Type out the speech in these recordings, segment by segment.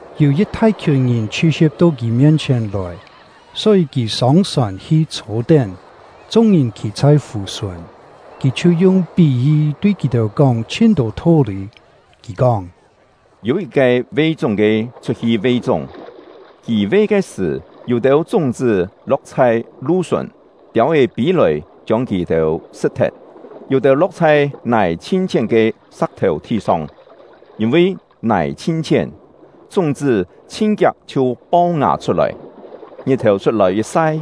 Yû yit thai-khiùn ngìn chhi-si̍p to kì mien-chhièn lòi, só-yî kì sông-sòn hi chhô-tén; chung-ngìn khî chhai fù-sùn. Kì chhiu yung pí-yi tui kì-têu kóng chhin-tô tho-lî. Kì kóng: “Yû yit-ke ve-chúng-ke chhut-hi ve-chúng. Kì ve ke sṳ̀, yû-têu chúng-chṳ́ lo̍k chhai lu-sùn, tiâu-é pî-lòi chiông kì-têu sṳ̍t-thet. Yû-têu lo̍k chhai nài chhin-chhién ke sa̍k-thèu thi-song; yîn-vi nài chhin-chhién, chúng-chṳ́ chhin-kiak chhiu pau-ngà chhut-lòi; ngit-thèu chhut-lòi yit sai,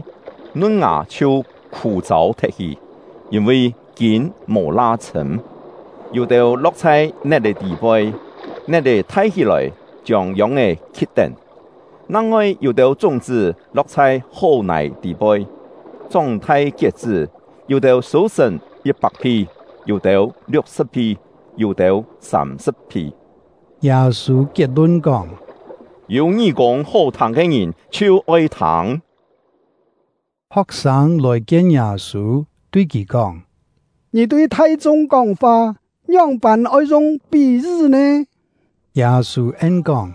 nun-ngà chhiu khû-châu thet-hi, yîn-vi kîn mò la chhṳ̂m. Yû-têu lo̍k chhai net-è tî-poi, net-è thai hí-lòi, chiông yông-é khi̍t-tén. Nang-ngoi yû-têu chúng-chṳ́ lo̍k chhai hó-nài tî-poi, chóng-thai kiet-chṳ́, yû-têu sû-sṳ̀n yit-pak-phi, yû-têu liuk-sṳ̍p-phi, yû-têu sâm-sṳ̍p-phi.” Yâ-sû kiet-lun kóng: “Yû ngí-kûng hó-thâng ke ngìn, chhiu oi thâng!” Ho̍k-sâng lòi-kien Yâ-sû, tui kì kóng: “Ngì tui thai-chung kóng-fa ngióng-pân oi yung pí-yi nè?” Yâ-sû en-kóng: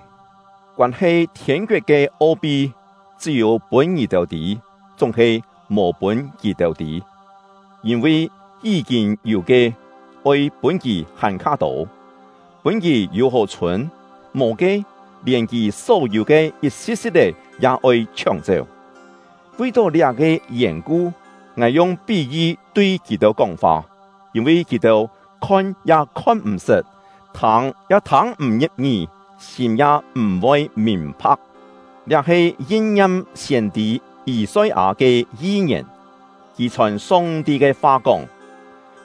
“Koân-he thiên-koet ke o-pi chṳ́-yû pûn ngì-têu tî, chúng-he mò pûn kì-têu tî. Yîn-vi yí-kîn yû ke, oi pûn kì hàn-kha tô, pûn kì yû-hó chhûn; mò ke, lièn kì só-yû ke yit-si̍t-si̍t-é ya oi chhióng-chéu. Vi-tó liá-ke yèn-ku, ngài yung pí-yi tui kì-têu kóng-fa; yîn-vi kì-têu khon ya khon m̀-sṳt, thâng ya thâng m̀ ngi̍p-ngí, sîm ya m̀-voi mìn-pha̍k. Liá he yin-ngiam siên-tî Yî-soi-â ke yi-ngièn; kì chhòn Song-ti ke fa kóng: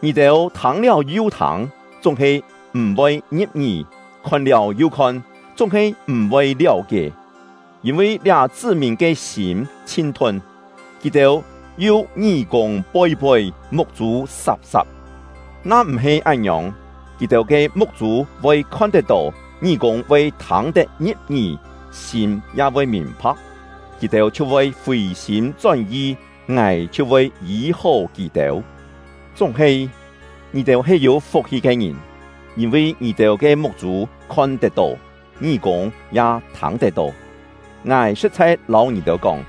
Ngì-têu thâng-liáu yu thâng, chúng-he m̀-voi ngi̍p-ngí; khon-liáu yu khon, chúng-he m̀-voi liáu-kié. Yîn-vi liá chṳ́-mìn ke sîm chhin-thun; kì-têu yu ngí-kûng poi-poi, muk-chû sap-sap. Na m̀-he án-ngiòng, kì-têu ke muk-chû voi khon-tet-tó, ngí-kûng voi thâng-tet ngi̍p-ngí, sîm ya voi mìn-pha̍k, kì-têu chhiu voi fì-sîm chón-yi, Ngài chhiu voi yî-hó kì-têu. “Chúng-he, ngì-têu he yû fuk-hi ke ngìn! Yîn-vi ngì-têu ke muk-chû khon tet-tó, ngí-kûng ya thâng tet-tó. Ngài sṳ̍t-chhai lâu ngì-têu kóng,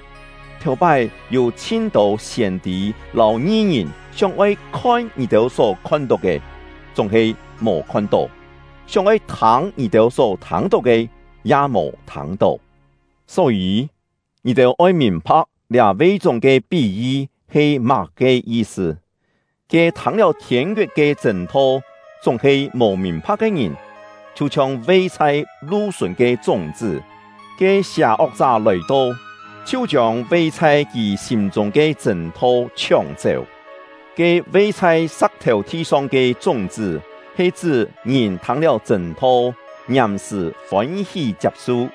thèu-pái yû chhin-tô siên-tî lâu ngi-ngìn sióng-oi khon ngì-têu só khon-tó ke, chúng-he mò khon-tó; sióng-oi thâng ngì-têu só thâng-tó ke, ya mò thâng-tó. “Só-yî, ngì-têu oi mìn-pha̍k liá ve-chúng ke pí-yi he má-ke yi-sṳ. Ke thâng-liáu thiên-koet ke chṳ̂n-tho chúng-he mò mìn-pha̍k ke ngìn, chhiu-chhiong ve chhai lu-sùn ke chúng-chṳ́; ke sià-ok-chá lòi-to, chhiu chiông ve chhai kì sîm-chûng ke chṳ̂n-tho chhióng-chéu. Ke ve chhai sa̍k-thèu thi-song ke chúng-chṳ́ he chṳ́ ngìn thâng-liáu chṳ̂n-tho, ngiàm-sṳ̀ fôn-hí chiap-su,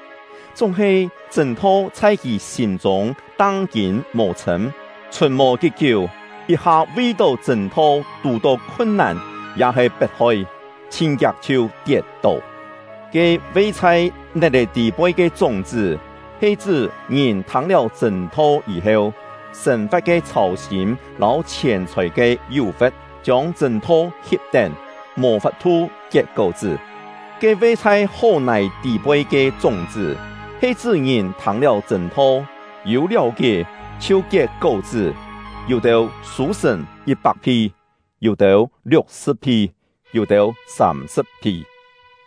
chúng-he chṳ̂n-tho chhai kì sîm-chûng tang-kîn mò chhṳ̂m, chhùn mò kí-kiú, yit-ha vi-tó chṳ̂n-tho tù-tó khun-nàn ya-he pet-hoi, chhin-kiak chhiu tiet-tó. Ke ve chhai net-è tî-poi ke chúng-chṳ́ he chṳ́ ngìn thâng-liáu chṳ̂n-tho yî-heu, sên-fa̍t ke chhâu-sîm lâu chhièn-chhòi ke yú-fe̍t chiông chṳ̂n-tho hip-tén, mò fap-thu kiet kó-chṳ́. Ke ve chhai hó-nài tî-poi ke chúng-chṳ́ he chṳ́ ngìn thâng-liáu chṳ̂n-tho, yû liáu-kié, chhiu kiet kó-chṳ́; yû-têu sû-sṳ̀n yit-pak-phi, yû-têu liuk-sṳ̍p-phi, yû-têu sâm-sṳ̍p-phi.”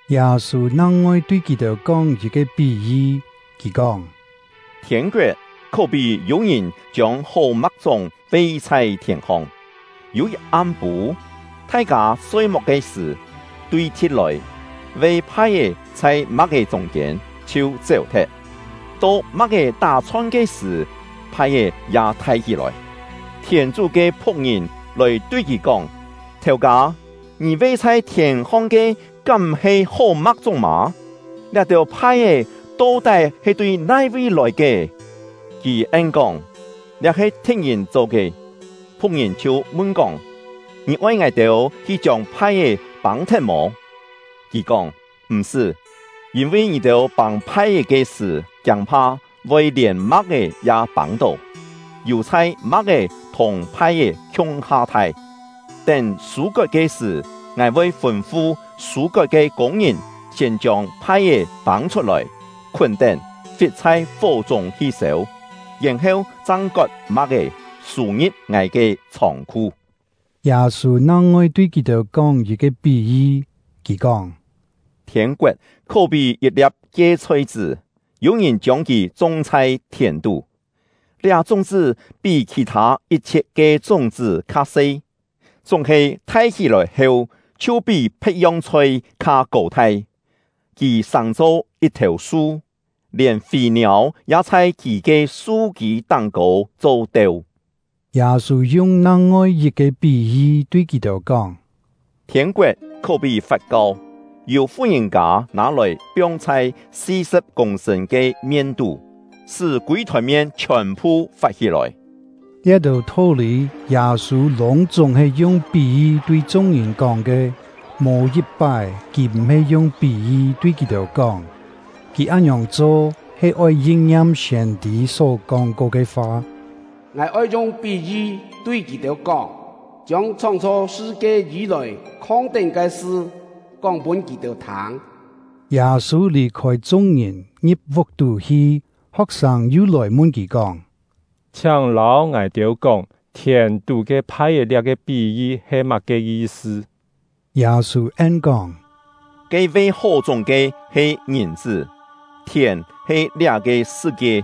Yâ-sû nang-ngoi tui kì-têu kóng yit-ke pí-yi. Kì kóng: “Thiên-koet khó-pí yû-ngìn chiông hó ma̍k-chúng ve chhai thièn-hong. Yû yit am-pû, thai-kâ soi-muk ke sṳ̀, tui-thi̍t lòi, ve phai-é chhai ma̍k-é chûng-kiên, chhiu chéu-thet. To ma̍k-é tá-chhon ke sṳ̀, phai-é ya thai hí-lòi. Thièn-chú ke phu̍k-ngìn lòi tui kì kóng: ‘Thèu-kâ, ngì ve chhai thièn-hong ke kám m̀-he hó ma̍k-chúng mâ? Liá-têu phai-é to-tái he tui nai-vi lòi ke?’ Kì en-kóng: ‘Liá he thi̍t-ngìn cho ke.’ Phu̍k-ngìn chhiu mun-kóng: ‘Ngì oi ngài-têu hi chiông phai-é pâng-thet mò?’ Kì kóng: ‘M̀-sṳ́! Yîn-vi ngì-têu pâng phai-é ke sṳ̀, kiâng-pha voi lièn ma̍k-é ya pâng-tó. Yù-chhai ma̍k-é thùng phai-é khiung-ha thai; tén sû-kot ke sṳ̀, ngài voi fûn-fu sû-kot ke kûng-ngìn siên chiông phai-é pâng chhut-lòi, khún-tén, fit chhai fó-chûng hi sêu, yèn-heu chang kot ma̍k-é, sû-ngi̍p ngài ke chhông-khu.’” Yâ-sû nang-ngoi tui kì-têu kóng yit-ke pí-yi. Kì kóng: “Thiên-koet khó-pí yit-lia̍p kie-chhoi-chṳ́, yû-ngìn chiông kì chung chhai thièn-tú. Liá chúng-chṳ́ pí khì-thâ yit-chhiet ke chúng-chṳ́ kha-se, chúng-he thai hí-lòi heu chhiu pí phe̍t-yong chhoi kha kô-thai; kì sàng-cho yit-thèu su, lièn fî-niâu ya chhai kì ke su-kî táng-kô cho-teu.” Yâ-sû yung nang-ngoi yit-ke pí-yi tui kì-têu kóng: “Thiên-koet khó-pí fat-kau, yû fu-ngìn-kâ nâ-lòi piong chhai si-sṳ̍p kûng-sṳ̂n ke mien-tú, sṳ́ kûi-thòn mien chhiòn-phu fat-hí-lòi.” Liá-têu tho-lî Yâ-sû lûng-chúng he yung pí-yi tui chung-ngìn kóng ke; mò yit-pái kì m̀-he yung pí-yi tui kì-têu kóng. Kì án-ngiòng cho, he oi yin-ngiam siên-tî só kóng-ko ke fa: “Ngài oi yung pí-yi tui kì-têu kóng, chiông chhóng-chho sṳ-kie yî-lòi khong-tén ke sṳ kóng pûn kì-têu thâng.” Yâ-sû lì-khôi chung-ngìn, ngi̍p vuk-tú hi. Ho̍k-sâng yu lòi mun kì kóng: “Chhiáng lâu ngài-têu kóng, thièn-tú ke phai-é liá-ke pí-yi he má-ke yi-sṳ?” Yâ-sû en-kóng: “Ke ve hó-chúng ke he Ngìn-chṳ́; thièn he liá-ke sṳ-kie;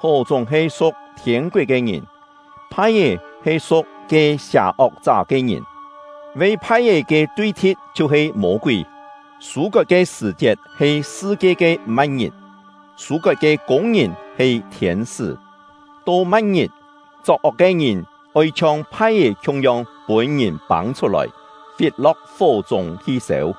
hó-chúng he su̍k thiên-koet ke ngìn; phai-é he su̍k ke sià-ok-chá ke ngìn; ve phai-é ke tui-thi̍t chhiu-he Mô-kúi; sû-kot ke sṳ̀-chiet he sṳ-kie ke ma̍t-ngit; sû-kot ke kûng-ngìn he thiên-sṳ́. To ma̍t-ngit, chok-ok ke ngìn oi chhiong phai-é khiung-yong pûn-ngìn pâng chhut-lòi, fit-lo̍k fó-chûng hi sêu.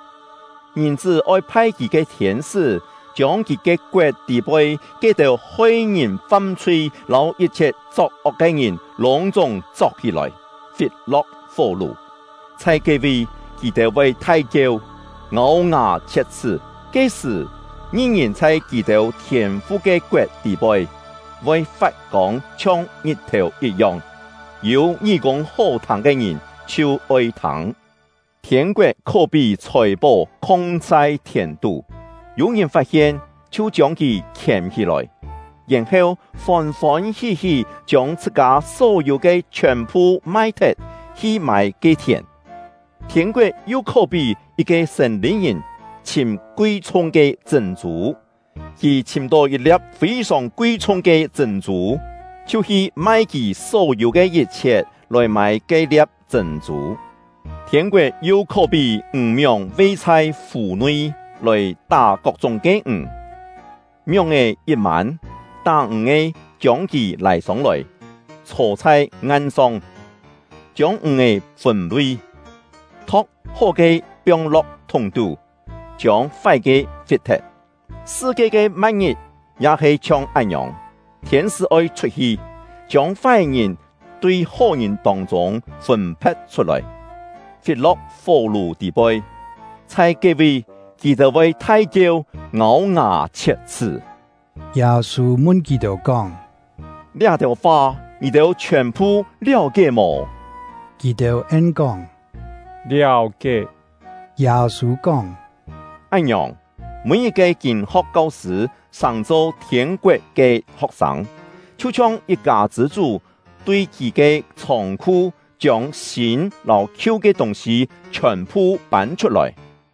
Ngìn-chṳ́ oi phai kì ke thiên-sṳ́, chiông kì ke koet tî-poi ke-têu hoi ngìn fam-chhui lâu yit-chhiet chok-ok ke ngìn lûng-chúng chok hí-lòi, fit-lo̍k fó-lù. Chhai ke-vi, kì-têu voi thai-kieu, ngâu-ngà chhiet-chhṳ́. Ke-sṳ̀, ngi-ngìn chhai kì-têu Thiên-fu ke koet tî-poi, voi fat-kông chhiong ngit-thèu yit-yong. Yû ngí-kûng hó-thâng ke ngìn, chhiu oi thâng! “Thiên-koet khó-pí chhòi-pó khong chhai thièn-tú. Yû-ngìn fat-hien, chhiu chiông kì khièm hí-lòi, yèn-heu fôn-fôn hí-hí chiông chhṳ-kâ só-yû ke chhiòn-phu mai-thet, hi mâi ke-thièn. “Thiên-koet yu khó-pí yit-ke sên-lî-ngìn chhìm kui-chhung ke chṳ̂n-chû. Kì chhìm-tó yit-lia̍p fî-sòng kui-chhung ke chṳ̂n-chû, chhiu hi mai kì só-yû ke yit-chhiet, lòi mâi ke-lia̍p chṳ̂n-chû. “Thiên-koet yu khó-pí ǹg-mióng ve chhai fù-nui lòi tá kok-chúng ke ǹg. Mióng-è yit mân, tá-ǹg-ke chiông kì lâi sông-lòi, chhô chhai ngan-song, chiông ǹg-è fûn-lui, tho̍k hó-ke piong-lo̍k thúng-tú, chiông fái-ke fit-thet. Sṳ-kie ke ma̍t-ngit ya he chhiong án-ngiòng: Thiên-sṳ́ oi chhut-hi, chiông fái-ngìn tui hó-ngìn tông-chûng fûn-phe̍t chhut-lòi, fit-lo̍k fó-lù tî-poi. Chhai ke-vi, kì-têu voi thai-kieu, ngâu-ngà chhiet-chhṳ́.” Yâ-sû mun kì-têu kóng: “Liá-têu fa ngì-têu chhiòn-phu liáu-kié mò?” Kì-têu en-kóng: “Liáu-kié.” Yâ-sû kóng: “Án-ngiòng, mî-yit-ke kîn-ho̍k kau-sṳ̂ sàng-cho thiên-koet ke ho̍k-sâng, chhiu-chhiong yit-kâ chṳ̂ chú tui kì ke chhông-khu chiông sîn lâu khiu ke tûng-sî chhiòn-phu pân chhut-lòi.”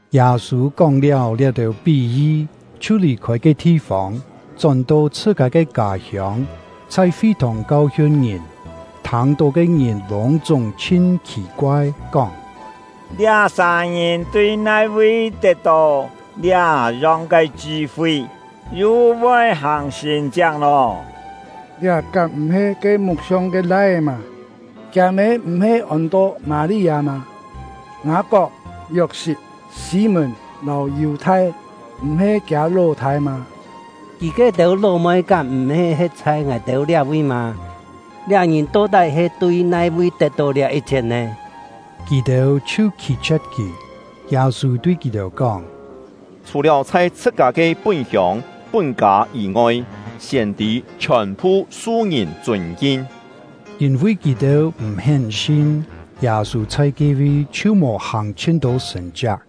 Yâ-sû kóng-liáu liá-têu pí-yi, chhiu lì-khôi ke thi-fông, chón-to chhṳ-kâ ke kâ-hiông, chhai fi-thòng kau-hiun ngìn; thâng-tó ke ngìn lûng-chúng chhin khì-koai, kóng: “Liá-sà ngìn tui nai-vi tet-tó liá-yong ke chṳ-fi, yu voi hàng sṳ̀n-chiak nò? Liá kám m̀-he ke muk-siong ke lai-é mâ? Kiâ-mê m̀-he ôn-to Mâ-li-â mâ? Ngâ-kok, Yok-sit, Sî-mùn lâu Yù-thai m̀-he kiâ ló-thâi mâ? Kì ke-têu ló-moi kám m̀-he he̍t chhai ngài-têu liá-vi mâ? Liá-ngìn to-tái he tui nai-vi tet-tó liá yit-chhiet nè?” Kì-têu chhiu khî-chhie̍t kì. Yâ-sû tui kì-têu kóng: “Chhù-liáu chhai chhṳ-kâ ke pún-hiông, pún-kâ yî-ngoi, siên-tî chhiòn-phu su ngìn chûn-kin.” Yîn-vi kì-têu m̀-hén sin, Yâ-sû chhai ke-vi chhiu mò hàng chhin-tô sṳ̀n-chiak.